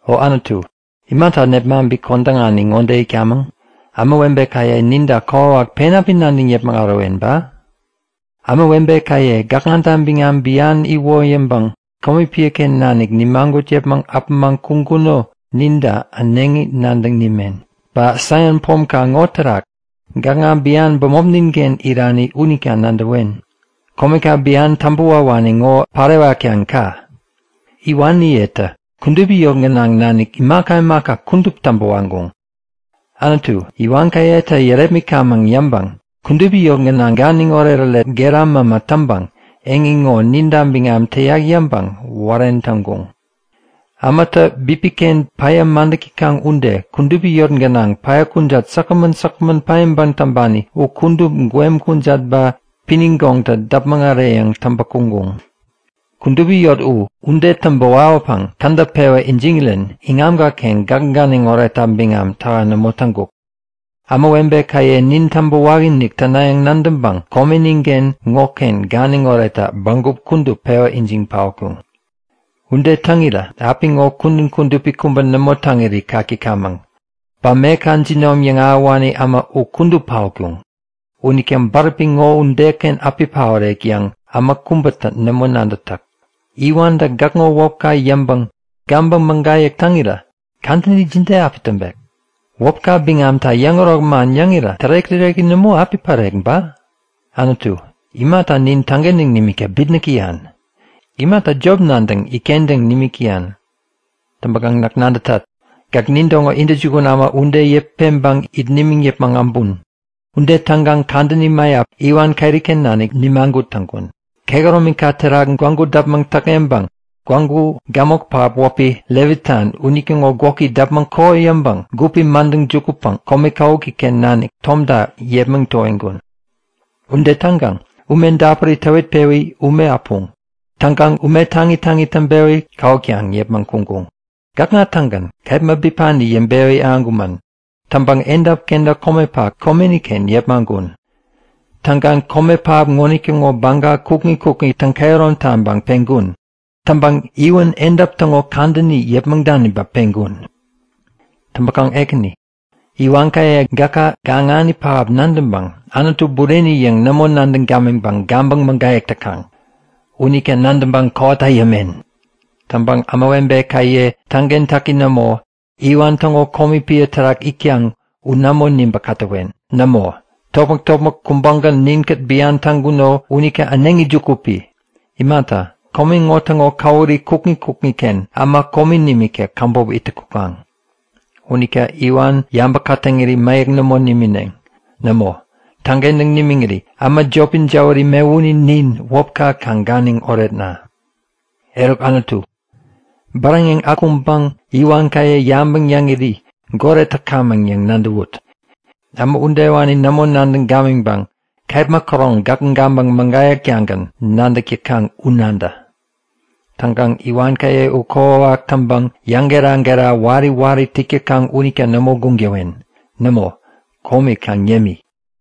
O Anutu, imata nipmaŋpi kodäŋani ŋode itkamäŋ? Ämawebekaye ninta kokwawak pen api nadäŋ yäpmäŋ ärowen ba? Ämawebekaye gäkŋata biŋam bian iwoyäŋpäŋ komi piäken nanik nimagut yäpmäŋ äpämaŋ kuŋkuno ninta äneŋi nadäŋ nimen. Ba Saion Pomka ŋo terak gäkŋa bian bämopninken irani unita nadäwen. Komeka biani täŋpäwawani ŋo pärewatkaŋ ka! Iwaniyetä kudupi yot gänaŋ nanik imaka imaka kudup täŋpä waŋkuŋ. Anutu, iwankayetä yärepmitkamäŋ yäŋpäŋ kudupi yot gänaŋ oretoret gera mämä täŋpäŋ eŋi ŋo ninta biŋam täyak yäŋpäŋ wären täŋkuŋ. Ämatä bipiken päya madäk täkaŋ ude kudupi yot gänaŋ päya kujat säkgämän säkgämän paiŋpäŋ täŋpani u kudup gwem kujat ba pinigoŋtä däpmäŋ äreyäŋ täŋpä kuŋkuŋ. Kudupi yotka u ude täŋpä wawäpäŋ kädäp pewä ijiŋirän iŋamkaken gäk ganiŋ oretta biŋam täha nämo täŋkuk. Ämawebekaye nin täŋpäwakinik tänayäŋ nadäŋpäŋ komeninken ŋoken ganiŋ oretta bägup kudup pewä ijiŋ paotkuŋ. Ude täŋirä apiŋo kudän kudupi kubä nämo täŋiri kak täkamäŋ. Ba meka jinom yäŋahäwani äma u kudup paotkuŋ. Unita bäräpi ŋo udeken api paorek yäŋ äma kubätä nämo nadätak. Iwantä gäkŋo wäpka yäŋpäŋ gabäŋ mägayäk täŋirä kadäni jide api täŋpek? Wäpka biŋamta yäŋärok man yäŋirä tärek-täreki nämo api pärek ba? Anutu, imata nin täŋkentäŋ nimikta bitnäk täyan? Imata jop nadäŋ itkentäŋ nimik täyan? Täŋpäkaŋ näk nadätat; Gäk nintäŋo intäjukun äma ude yäput peŋpäŋ it nimiŋ yäpmäŋ äbun. Ude täŋkaŋ kadäni mäyap iwan keriken nanik nimagut täŋkun. Kehäromika terak gwägu däpmäŋ täkŋeŋpäŋ gwägu gämok pähap wäpi Levitan unitäŋo gwäki däpmäŋ kokoyäŋpäŋ gupi madäŋ jukutpäŋ kome kawukiken nanik tomta yepmäŋ towiŋkun. Ude täŋkaŋ ume dapuri täwitpewi ume äpuŋ. Täŋkaŋ ume taŋi taŋi täŋpewi kawuktaŋ yäpmäŋ kuŋkuŋ. Gäkŋa-tägän kepma bipani yäŋpewi ahäŋkumän. Täŋpäŋ edap kenta komepak komeniken yepmaŋkun. Täŋkaŋ kome pähap ŋonitäŋo baga kukŋi kukŋi täŋ-kehärom taŋpäŋ peŋkun. Täŋpäŋ iwän edap täŋo kadäni yäpmäŋ daniŋpäŋ peŋkun. Täŋpäkaŋ Ekäni, iwankaye gäka gaŋani pähap nadäŋpäŋ Anutu bureni yäŋ nämo nadäŋ gamiŋpäŋ gabäŋ mägayäk täkaŋ. Unita nadäŋpäŋ kowata yämen. Täŋpäŋ ämawebekaye täŋkentäki nämo, iwan täŋo komi piä terak itkaŋ u nämo nibä-kätäwen. Nämo, topmäk-topmäk kubägän ninkät bian täŋkuno unita äneŋi juku pi! Imata, kome ŋo täŋo käwuri kukŋi kukŋiken äma komi nimikta käbop ittäŋ kukaŋ. Unita iwan yabä-kätäŋiri mäyäk nämo nimineŋ. Nämo, täŋkentäŋ nimiŋiri äma jopi jäwäri mewuni nin wäpka kaŋ ganiŋ oretna! Eruk Anutu, bäräŋeŋ akuŋpäŋ iwankaye yabäŋ yäŋiri goret täkamäŋ yäŋ nadäwut. Äma udewani nämo nadäŋ gamiŋkaŋ kepma käroŋ gäk gabäŋ mägayäktagän nadäk täkaŋ u nadä! Täŋkaŋ iwankaye u kokwawak täŋpäŋ yäŋgera-gera wari wari yäk täkaŋ unita nämo guŋ täwen! Nämo, komi kaŋ yämi.